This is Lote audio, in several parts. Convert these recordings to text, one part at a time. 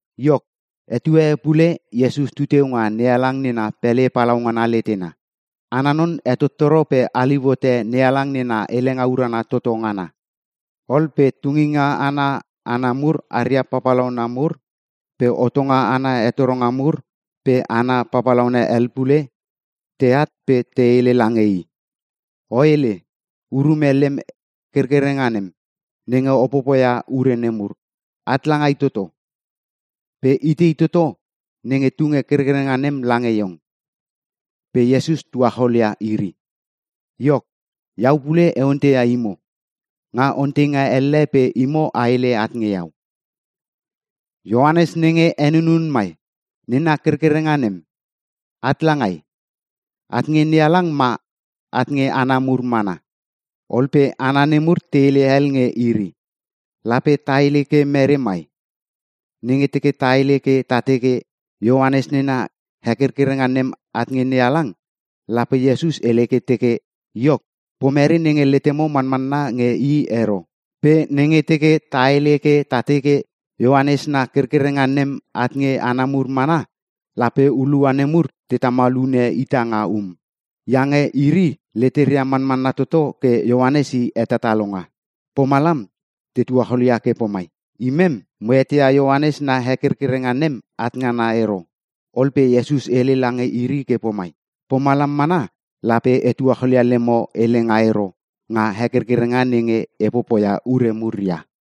Iok, etue e pule Iesus tu teu nga NeHalang nena pele palaungana letena. Ana non hetottoro pe haliu hote NeHalang nena helenga urana toto ngana. Ol pe tunginga ana hana mur aria papalauna mur pe hotonga ana hetoronga mur pe hana papalauna hel pule teat pe te hele lange i, “O hele urume lem kerkerenga nem, nenge o popoia ure nemur. At langai toto? Pe itei toto nenge tunge kerkerenga nem lange iong?” Pe Iesus tuacholia iri, “Iok, iau pule e onteia imo nga onteinga elle pe imo a hele at nge iau. Ioanes nenge henunun mai nena kerkerenga nem, at langai? At nge NeHalang ma at nge hana mur mana?” Ol pe hana nemur te hele hel nge iri, “Lape ta hele ke mere mai? Nenge teke ta hele ke ta teke, ‘Ioanes nena hekerkereng nem at nge NeHalang’, lape Iesus hele ke teke, ‘Iok, pomere nenge letemo manmanna nge i ero?’ Pe nenge teke ta hele ke ta teke, ‘Ioanes na kerkerenga nem at nge hana mur mana’, lape hulua nemur te tamal hune ita nga um. Iange iri leteria manmanna toto ke Ioanes i hetatalonga!” Pomalam te tuacholia ke pomai, “Imem mo eteia Ioanes na hekerkerenga nem at ngana ero.” Ol pe Iesus hele lange iri ke pomai, “Pomalam mana lape e tuacholia lemo helenga ero nga hekerkerenga nenge e popoia ure mur ia.”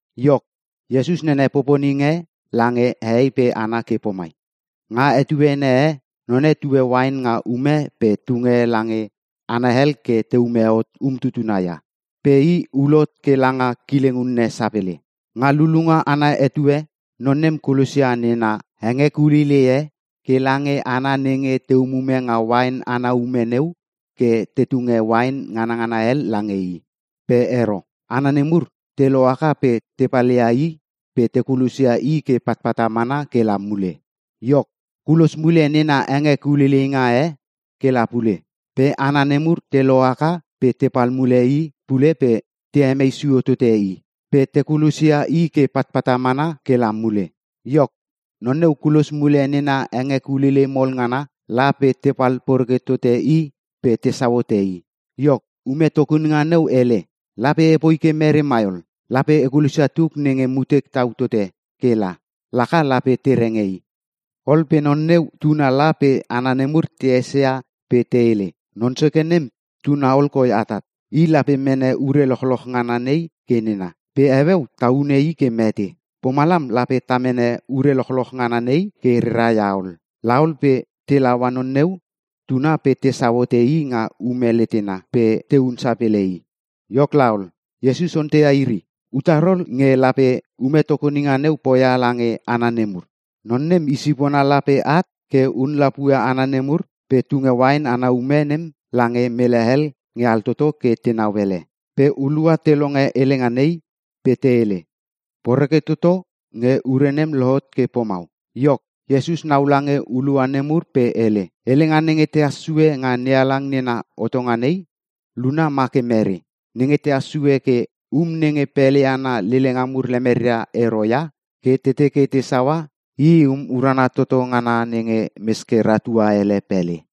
Iok, Iesus nene poponing e lange hehei pe hana ke pomai, “Nga etuene e, none tue uain nga ume pe tunge lange hana hel ke te ume hot umtutuna ia. Pe i ulhot ke langa kileng unne sapele. Nga lulunga ana etue, non nem kulosia nena hengekuleilei e ke lange hana nenge te umume nga uain ana ume neu ke te tunge uain nganangana hel lange i. Pe ero. Hana nemur te lohaka pe te palia i pe te kulosia i ke patpata mana ke la mule. Iok, kulos mule nena hengekuleileinga e ke la pule. Pe hana nemur te lohaka pe tepal mule i pule pe te hemei sio tote i. Pe te kulosia i ke patpata mana ke la mule. Iok, non neu kulos mule nena hengekuleilei mol ngana la pe tepal poreke tote i pe tesau hote i. “Iok, ume tokoninga neu hele, ‘Lape epoi ke mere mai ol? Lape e kulosia tuk nenge mutek tau tote ke la, laka lape te renge i.’ “Ol pe non neu tuna la pe hana nemur te esia pe te hele, ‘Non soke nem tuna ol koi atat. I lape mene ure lochloch ngana nei ke nena. Pe heueu ta hune i ke mete. Pomalam lape ta mene ure lochloch ngana nei ke rera ia ol.’ La ol pe te laua non neu tuna pe tesau hote i nga ume letena pe tehun sapele i.” Iok laol, Iesus onteia iri, “Utar ol nge lape ume tokoninga neu poia lange hana nemur? Non nem i sipona lape at ke hun lapue hana nemur pe tunge uain ana ume nem lange mele hel nge altoto ke tenau ele.” Pe hulua te longe helenga nei pe te hele, “Poreke toto nge ure nem lohot ke pomau!” Iok, Iesus nau lange hulua nemur pe hele, “Helenga nenge tehas sue nga NeHalang nena hotonga nei, luna ma ke mere? Nenge tehas sue ke, ‘Um nenge pele ana lelenga mur lemeria ero ia ke te teke tesaua, i um urana toto ngana nenge mes ke rahtua ele pele.’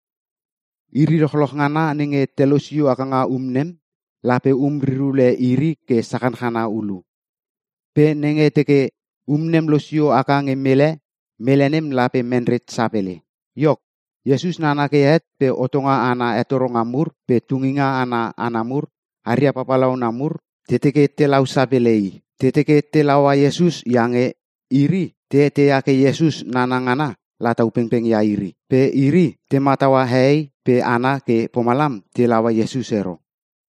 “Iri lochloch ngana nenge te losio haka nga um nem, lape um rir ule iri ke sachanchana ulu. Pe nenge teke um nem losio haka nge mele, mele nem lape menret sapele.” Iok, Iesus nana ke het pe hotonga ana hetoronga mur pe tunginga ana hana mur aria papalauna mur te teke telau sapele i. Te teke te laua Iesus iange iri te eteia ke Iesus nana ngana latau pengpeng ia iri. Pe iri te mataua hehei pe hana ke pomalam te laua Iesus ero.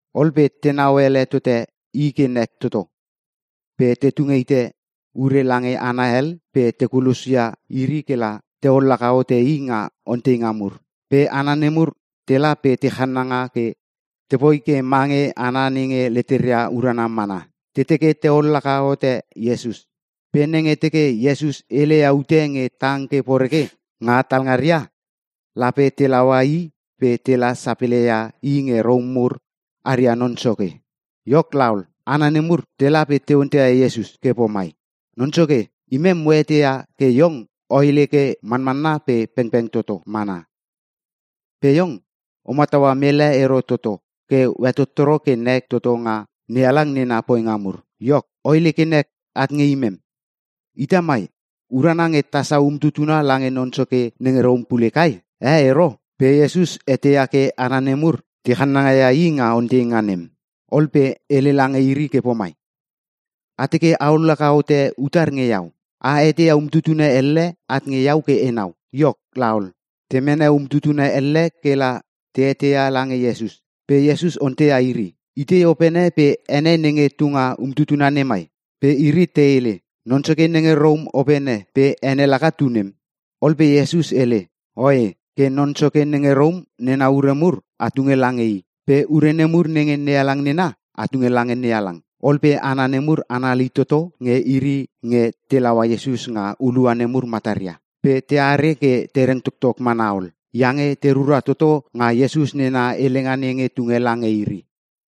Ol pe tenau ele tote i ke nek toto, pe te tung hite ure lange hana hel pe te kulosia iri ke la te ollaka hote i nga onteinga mur. Pe hana nemur tela pe te chananga ke tepoi ke mange hana nenge leteria urana mana. Te teke te ollaka hote Iesus, pe nenge teke Iesus heleia ute nge tang ke poreke nga talngaria, lape te laua i pe tela sapele ia i nge Rom mur aria non soke. Iok laol, hana nemur tela pe te onteia Iesus ke pomai, “Non soke, imem mo eteia ke iong o hele ke manmanna pe pengpeng toto mana. Pe iong o mataua mele ero toto ke o hetottoro ke nek toto nga NeHalang nena poinga mur. Iok, o hele ke nek at nge imem. Ita mai urana nge tasau umtutuna lange non soke nenge Rom pule kai? Eh, ero?” Pe Iesus eteia ke hana nemur te chananga ia i nga onteinga nem, ol pe hele lange iri ke pomai, “A teke a ollaka hote utar nge iau? A heteia umtutuna elle at nge iau ke enau.” Iok laol, te mene umtuna elle ke la te heteia lange Iesus. Pe Iesus onteia iri, “Itei opene pe ene nenge tunga nga umtuna nemai?” Pe iri te hele, “Non soke nenge Rom opene pe ene laka tu nem.” Ol pe Iesus hele, “Oe, ke non soke nenge Rom nena ure mur a tunge lange i. Pe ure nemur nenge NeHalang nena, a tunge lange NeHalang.” Ol pe hana nemur, anali toto nge iri nge te laua Iesus nga hulua nemur mataria. Pe teare ke te reng toktok mana ol. Iange te rura toto nga Iesus nena helenga nenge tunge lange iri.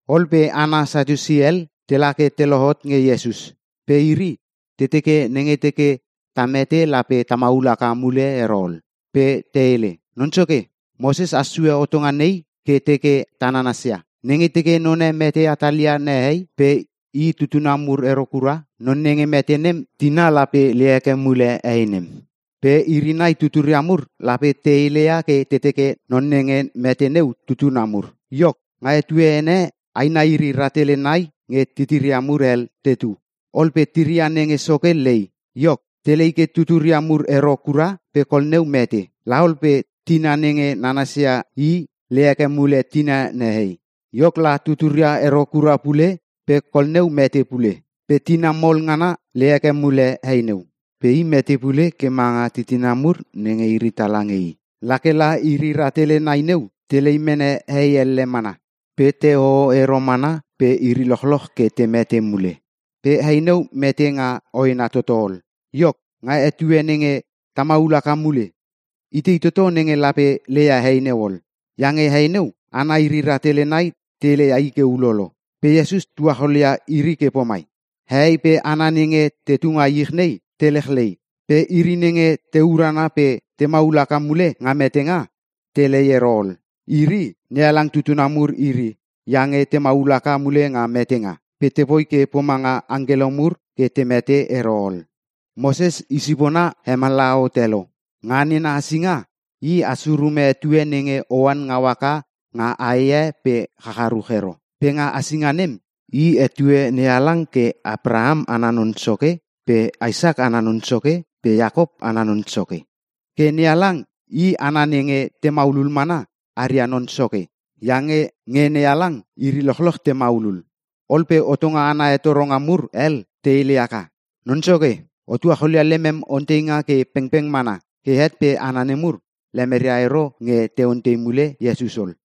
Ol pe hana Satiusi hel tela ke te lohot nge Iesus. Pe iri te teke, nenge teke ta mete lape ta maul haka mule ero ol. Pe te hele, “Non soke, Moses has sue hotonga nei ke teke ta nanasia: ‘Nenge teke none mete hatalia nehei pe i tutuna mur ero kura, non nenge mete nem, tina lape lei heke mule hei nem. Pe iri nai tuturia mur lape te heleia ke teke non nenge mete neu tutuna mur.’ Iok, nga etuene e aina iri rahtele nai nge titiria mur hel tetu. Ol pe tiria nenge soke lei. Iok, telei ke tuturia mur ero kura pe kol neu mete. Laol pe tina nenge nanasia i lei heke mule tina nehei. Iok la, tuturia ero kura pule, pe kol neu mete pule. Pe tina mol ngana lei heke mule hei neu, pe i mete pule ke manga titina mur nenge iri tala nge i. La ke la iri rahtele nai neu telei mene hei elle mana. Pe te hoho ero mana pe iri lochloch ke te mete mule. Pe hei neu mete nga hoena toto ol. Iok, nga etue nenge ta maul haka mule, itei toto nenge lape leia hei neu ol? Iange hei neu, hana iri rahtele nai te leia i ke ulolo.” Pe Iesus tuacholia iri ke pomai, “Hehei pe hana nenge tetu nga ich nei te lechlei. Pe iri nenge te urana pe te maul haka mule nga metenga, telei ero ol. Iri, NeHalang tutuna mur iri iange te maul haka mule nga metenga. Pe tepoi ke pomanga angkelo mur ke te mete ero ol. Moses i sipona hemallaha hote lo. Nga nena hasinga, i has urume etue nenge oan ngau haka nga ae e pe chacharuch ero. Pe nga hasinga nem, i hetue NeHalang ke Abraham ana Non Soke pe Isak ana Non Soke pe Iakop ana Non Soke. Ke NeHalang i hana nenge te maulul mana, aria Non Soke. Iange nge NeHalang iri lochloch te maulul” Ol pe hotonga ana hetoronga mur hel te hele haka, “Non Soke, o tuacholia lemem onteinga ke pengpeng mana!” Ke het pe hana nemur lemeria ero nge te ontei mule Iesus ol.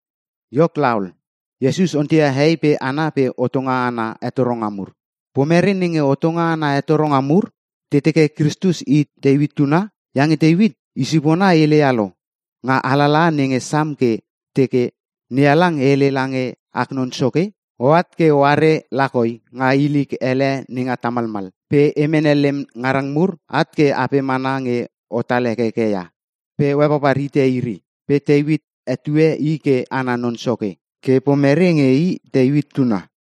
Iok laol, Iesus onteia hehei pe hana pe hotonga ana hetoronga mur, “Pomere nenge hotonga ana hetoronga mur te teke Kristus i Teuit tuna? Iange Teuit i sipona heleia lo nga alalaha nenge Sam ke teke, “‘NeHalang hele lange ak Non Soke: “Oat ke oare lakoi nga ilik hele nenga tamalmal. Pe e mene lem ngarang mur at ke apem ana nge otal hekeke ia. Pe o hepapar hite iri.” ’ Pe Teuit hetue i ke i ana Non Soke, ke pomere nge i Teuit tuna?”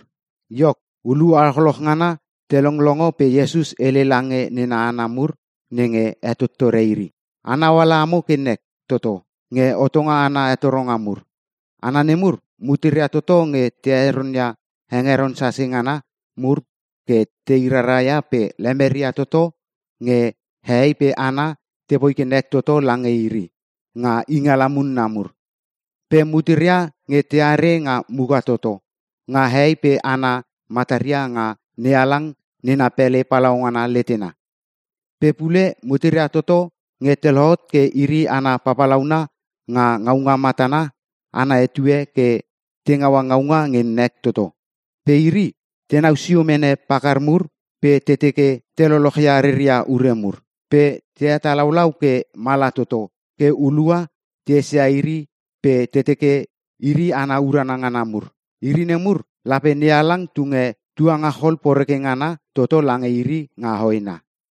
Iok, hulua lochloch ngana te longlongo pe Iesus hele lange nena hana mur nenge hetottore iri, “Anau ala amo ke nek toto nge hotonga ana hetoronga mur. Hana nemur, muteria toto nge te heronia hengeron sase ngana mur ke tei raraia pe lemeria toto nge hehei pe hana tepoi ke nek toto lange iri nga ingala munna mur. Pe muteria nge teare nga muka toto nga hehei pe hana mataria nga NeHalang nena pele palaungana letena. Pe pule muteria toto nge te lohot ke iri hana papalauna nga ngaunga matana ana etue ke te ngaua ngaunga nge nek toto. Pe iri, tenau sio mene pakar mur pe te teke te lolochia reria ure mur. Pe te hetalaulau ke mala toto ke hulua te esia iri pe te teke iri hana urana ngana mur. Iri nemur, lape NeHalang tunge tuangachol poreke ngana toto lange iri nga hoena.”